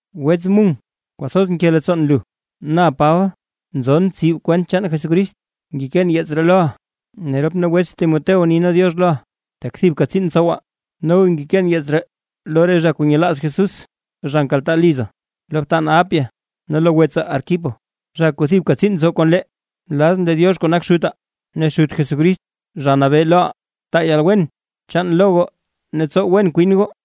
Wets Mung kwathoz nke leettsoon lu. Na Paba, nzon tsib kwent chaan Jesucrist, ngekeen yeets ree loʼa, ne rop nee wets Tim ni nee “diox” loʼa tak thibka tsiin ntsowaa. Noga ngekeen yeets ree lo re zha kuu nyelaaz Jesús zha nkaltaa liza, lo btanaa Apia, ne lo wets Arquipo, zha kuu thibka tsiin ntsow kon lee. Nlazʼn lee Diox kuu nak Xutaa ne Xut Jesucrist, Zha Nabee loʼaa, taa yalwen chaan lo goo ne tsow wen kwin goo.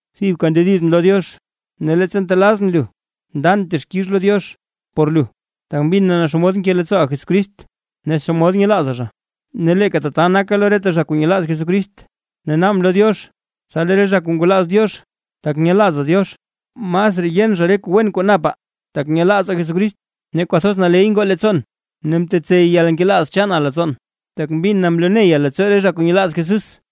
Thibka ndedizʼn lo Diox ne leettsa ntelazʼn lu ndan texkix lo Diox por lu. Tak mbin na xomod nke leettsooʼa Jesucrist ne xomod nyelaaza zha, ne leeka tata naka lo reta zha kuu nyelaaz Jesucrist. Ne naabʼn lo Diox tsa lee re zha kuu ngwalaaz Diox, tak nyelaaza Diox masraa yen zha re kuu wen kuu napaa tak nyelaazaa Jesucrist. Ne kwathoz naley ngoo leettsoon ne mtsey yalnkelaaz chaana leettsoon, tak mbin na mloo neya leettsoo re zha kuu nyelaaz Jesús.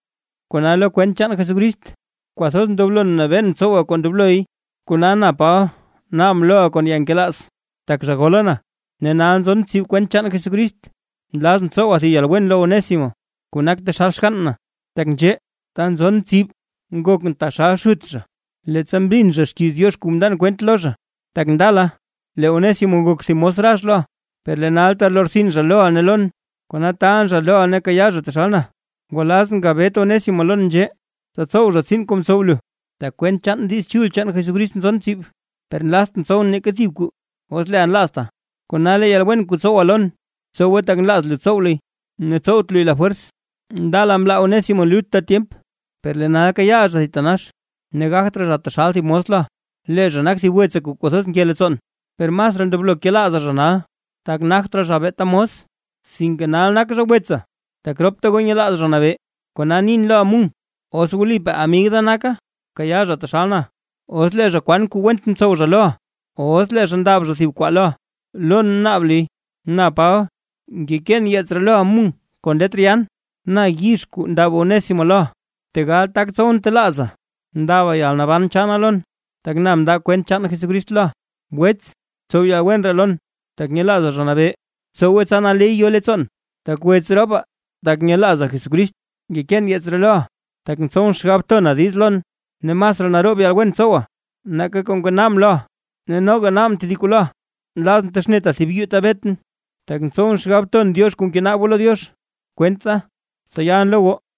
Kona lo kwent chaan Jesucrist, kwathoz ndoblon nabeen tsowa kuu ndobloy, kona na Paba naabʼn loʼa kon yalnkelaaz. Tak zha gola na, ne nal nzon tsib kwent chaan Jesucrist, nlazʼn tsowa thib yalwen lo Onésimo kuu nak taxal xgann na. Tak nzhee, ta nzon tsib nakʼn taxal xut zha, leettsa mbin zha xkiiz Diox kuu mndan kwent lo zha. Tak ndala, lee Onésimo ngok thib mos rax loʼa, per lee nal talortsin zha loʼa ne lon. Kona taalʼn zha loʼa ne bkayaa zha taxal na. Ngwalazʼn gabet Onésimo lon nzhee, tsa tsow zha tsiin kuu mtsow lu, tak kwent Diiz Chul chaan Jesucrist nzon tsib. Per nlaztʼn tsowʼn neeka thib kuu os leeʼa nlaazta, kona lee yalwen kuu tsowa lon btsowe tak nlaaza tsow luy, ne tsowt luy lafwers. Ndala mlaa Onésimo lu lutta tyemp, per lee nal kayaaʼa zha thitanax; ne gagt raa zha taxal thib mos loʼa, lee zha nak thib wetsaa kuu kwathoz nke leettsoon. Per masraa ndobloʼa kelaaza zha nal, tak nagt raa zha beeta mos, sinke nal nak zha wetsa tak ropta goo nyelaaz Zha Nabee. Kona nin loʼa Mung, os wlipaa amig da naka bkayaa zha taxal na. Os lee zha kwan kuu went mtsow zha loʼa o os lee zha ndab zha thib kwaa loʼa, lon naab luy. Na Paba, ngekeen yeets ree loʼa Mung kon letr yaan. Na yizh kuu ndab Onésimo loʼa; tegal tak tsowʼn telaaza ndaba yalnaban chaana lon, tak na mnda kwent chaan Jesucrist loʼa. Wets, btsow yalwen ree lon, tak nyelaaza Zha Nabee, btsowe tsa naley yo leettsoon, tak wets ropaa tak nyelaazaa Jesucrist. Ngekeen yeets ree loʼa, tak ntsowʼn xgab tona diiz lon, ne masraa naroob yalwen tsowaa nake kuu ngenaabʼn loʼa. Ne noga naabʼn tedib kuu loʼa, nlazʼn texneta thib yuu ta betʼn; tak ntsowʼn xgab ton Diox re kuu ngenaab goo lo Diox kwent da, tsa yalʼn lo goo.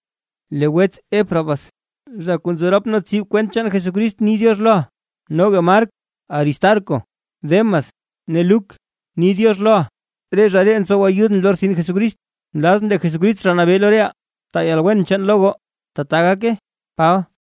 Lee wets Epafras, zha kuu nzo rop nee tsib kwent chaan Jesucrist ni “diox” loʼa. Noga Mark, Aristarco, Demas ne Luk, ni “diox” loʼa. Re zha ree ntsow ayudʼn lo rtsin Jesucrist. Nlazʼn lee Jesucrist, Zha Nabee lo reʼaa, taa yalwen chaan lo goo. ¡Tbaa gake! Paba